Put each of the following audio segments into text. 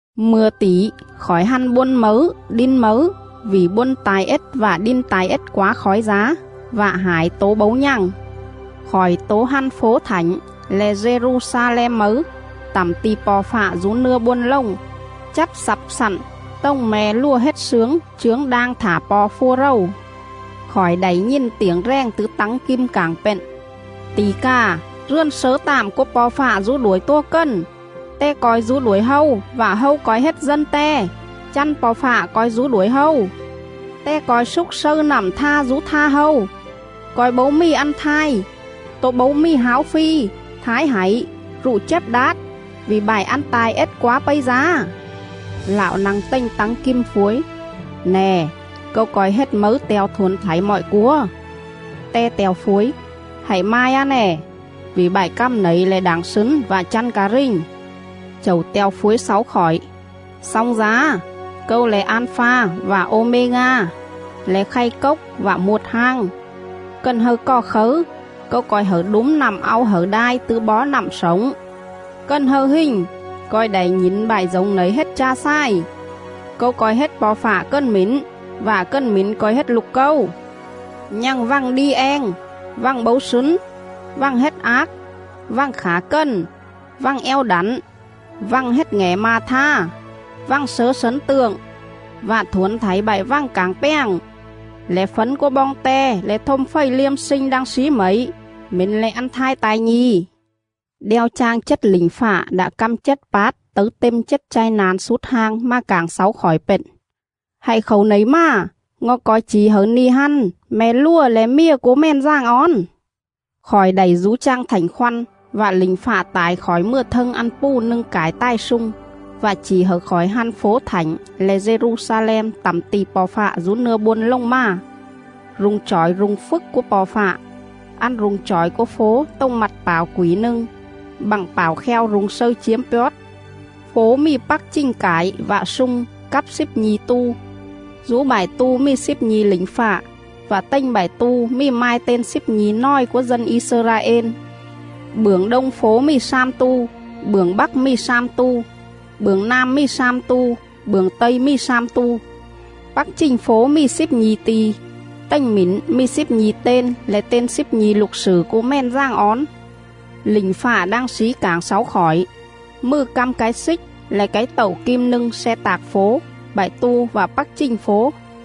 Mư̱a tỉ khỏi hăn bôn mấư đin mấư; vỉ bôn ta̱i ết vạ đin ta̱i ết quá khói dá, vạ hải tố bấu nhằng.. Khỏi tố hăn fố thảnh, le̱ Dê-ru-xa-lem mấư, tẳm ti̱ Po̱ Fạ dú nưa bôn lồng, chắp xặp slặn tồng me̱ lùa hết slướng chướng đang thả po̱ phua rầu.. Khỏi đảy nhìn tiểng rèng tứ tắng kim cảng pện: “Tỉ cà, rườn slớ tạm cúa Po̱ Fạ dú đuổi tua cần! Te co̱i dú đuổi hâu vạ hâu co̱i hết dân Te; chăn Po̱ Fạ co̱i dú đuổi hâu.. Te co̱i xúc slâư nặm tha dú tha hâu. Co̱i bấu mì ăn thai, tố bấu mì háo phi, thái hảy, rụ chếp đát; vỉ bại ăn ta̱i ết quá pây dá.”. Lạo nă̱ng tềnh tắng kim phuối: “Nè, Câu co̱i hết mấư te̱o thuổn thảy mọi cúa.” Te te̱o phuối: “Hạy mai a nè, vỉ bại cằm nẩy le̱ đảng slứn vạ chăn ca rình.” Chẩu te̱o phuối xáu khỏi: “Xong dá! Câu le̱ An-pha vạ Ô-mê-nga, le̱ Khay Cốc vạ Muột Hang. Cần hâư cò khấư, Câu co̱i hẩư đúm nặm au hẩư đai tứ bó nặm slổng.. Cần hâư hình co̱i nhỉn đảy bại dổng nẩy hết cha xài; Câu co̱i hết Po̱ Fạ cần mỉn, vạ cần mỉn co̱i hết lục Câu.. Nhằng vằng đi eng, vằng bấu slứn, vằng hết ác, vằng khả cần, vằng eo đẳn, vằng hết ngẻ ma̱ tha, vằng slớ slấn tượng, vạ thuổn thảy bại vằng cảng pjàng, lẻ fấn cúa boong te le̱ thôm fầy liêm slinh đang slí mẩy. Mỉn le̱ ăn thai ta̱i nhi̱.” Đeo chang chết lỉnh fạ đạ căm chết pát tấư têm chết chai na̱n slút hang mà cảng xáu khỏi pện: “Hạy khảu nẩy mà, ngo̱ co̱i chỉ hẩư ni̱ hăn Me̱ Lùa le̱ Mjề cúa Mèn Dàng Ón.” Khỏi đảy dú chang Thảnh Khoăn, vạ lỉnh fạ tải khỏi mừa thâng ăn pù nâng cải tài slung, vạ chỉ hẩư khỏi hăn fố thảnh le̱ Dê-ru-xa-lem tẳm ti̱ Po̱ Fạ dú nưa bôn lồng mà,. rung chỏi rung phjức cúa Po̱ Fạ; ăn rung chỏi cúa fố tồng mặt pảo quỉ nâng, bặng pảo kheo rung slâư chiếm pjót. Fố mì pắc chình cải vạ slung cắp slíp nhi̱ tu. Dú bại tu mì slíp nhi̱ lỉnh fạ, vạ tềnh bại tu mì mai ten slíp nhi̱ nòi cúa dân I-xơ-ra-ên.. Bưởng đông fố mì slam tu, bưởng bắc mì slam tu, bưởng nam mì slam tu, bưởng tây mì slam tu. Pắc chình fố mì slíp nhi̱ ti̱, tềnh mỉn mì slíp nhi̱ ten le̱ ten slíp nhi̱ lục slử cúa Mèn Dàng Ón. Lỉnh fạ đang slí cảng xáu khỏi, mừ căm cái xích le̱ cái tậu kim nâng sle tạc fố, bại tu vạ pắc chình fố..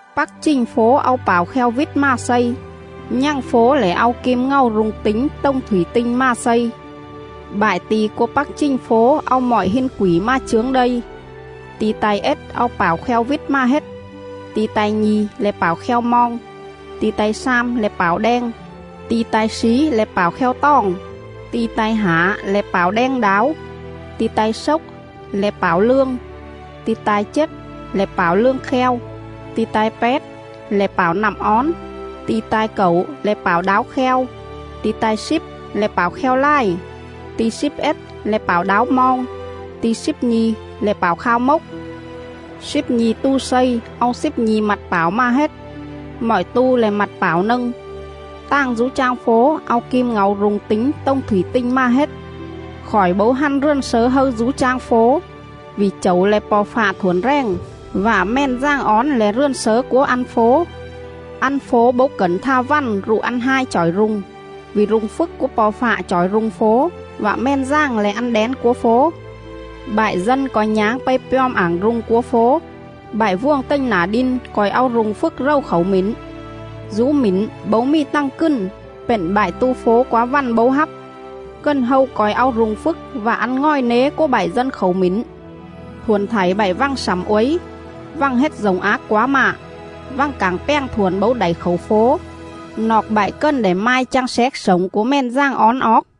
Pắc chình fố au pảo kheo vít mà xây, nhằng fố lẻ au kim ngàu rung tính tồng thủy tinh mà xây.. Bại ti̱ cúa pắc chình fố au mọi hin quỉ mà chướng đây. Ti̱ ta̱i ết au pảo kheo vít mà hết, ti̱ ta̱i nhi̱ le̱ pảo kheo moong, ti̱ ta̱i slam le̱ pảo đeng, ti̱ ta̱i slí le̱ pảo kheo toòng, ti̱ ta̱i hả le̱ pảo đeng đáo, ti̱ ta̱i xốc le̱ pảo lương, ti̱ ta̱i chết le̱ pảo lương kheo, ti̱ ta̱i pét le̱ pảo nặm ón, ti̱ ta̱i cẩu le̱ pảo đáo kheo, ti̱ ta̱i slíp le̱ pảo kheo lài, ti̱ slíp ết le̱ pảo đáo moong, vạ ti̱ slíp nhi̱ le̱ pảo khao mốc. Slíp nhi̱ tu xây au slíp nhi̱ mặt pảo mà hết, mọi tu le̱ mặt pảo nâng. Tàng dú chang fố au kim ngàu rung tính tồng thủy tinh mà hết. Khỏi bấu hăn rườn slớ hâư dú chang fố, vỉ Chẩu le̱ Po̱ Fạ Thuổn Rèng vạ Mèn Dàng Ón le̱ rườn slớ cúa ăn fố. Ăn fố bấu cẩn tha vằn rụ ăn hai chỏi rung, vỉ rung phjức cúa Po̱ Fạ chỏi rung fố, vạ Mèn Dàng le̱ ăn đén cúa fố.. Bại dân co̱i nháng pây pjom ảng rung cúa fố; bại vuồng tềnh nả đin co̱i au rung phjức rầu khảu mỉn.. Dú mỉn bấu mì tằng cừn, pện bại tu fố quá vằn bấu hắp.. Cần hâu co̱i au rung phjức vạ ăn ngòi nế cúa bại dân khảu mỉn. Thuổn thảy bại vằng slẳm uối, vằng hết dổng ác quá mạ, vằng cảng pjàng thuổn bấu đảy khảu fố, noọc bại cần đảy mai chang xéc slổng cúa Mèn Dàng Ón oóc..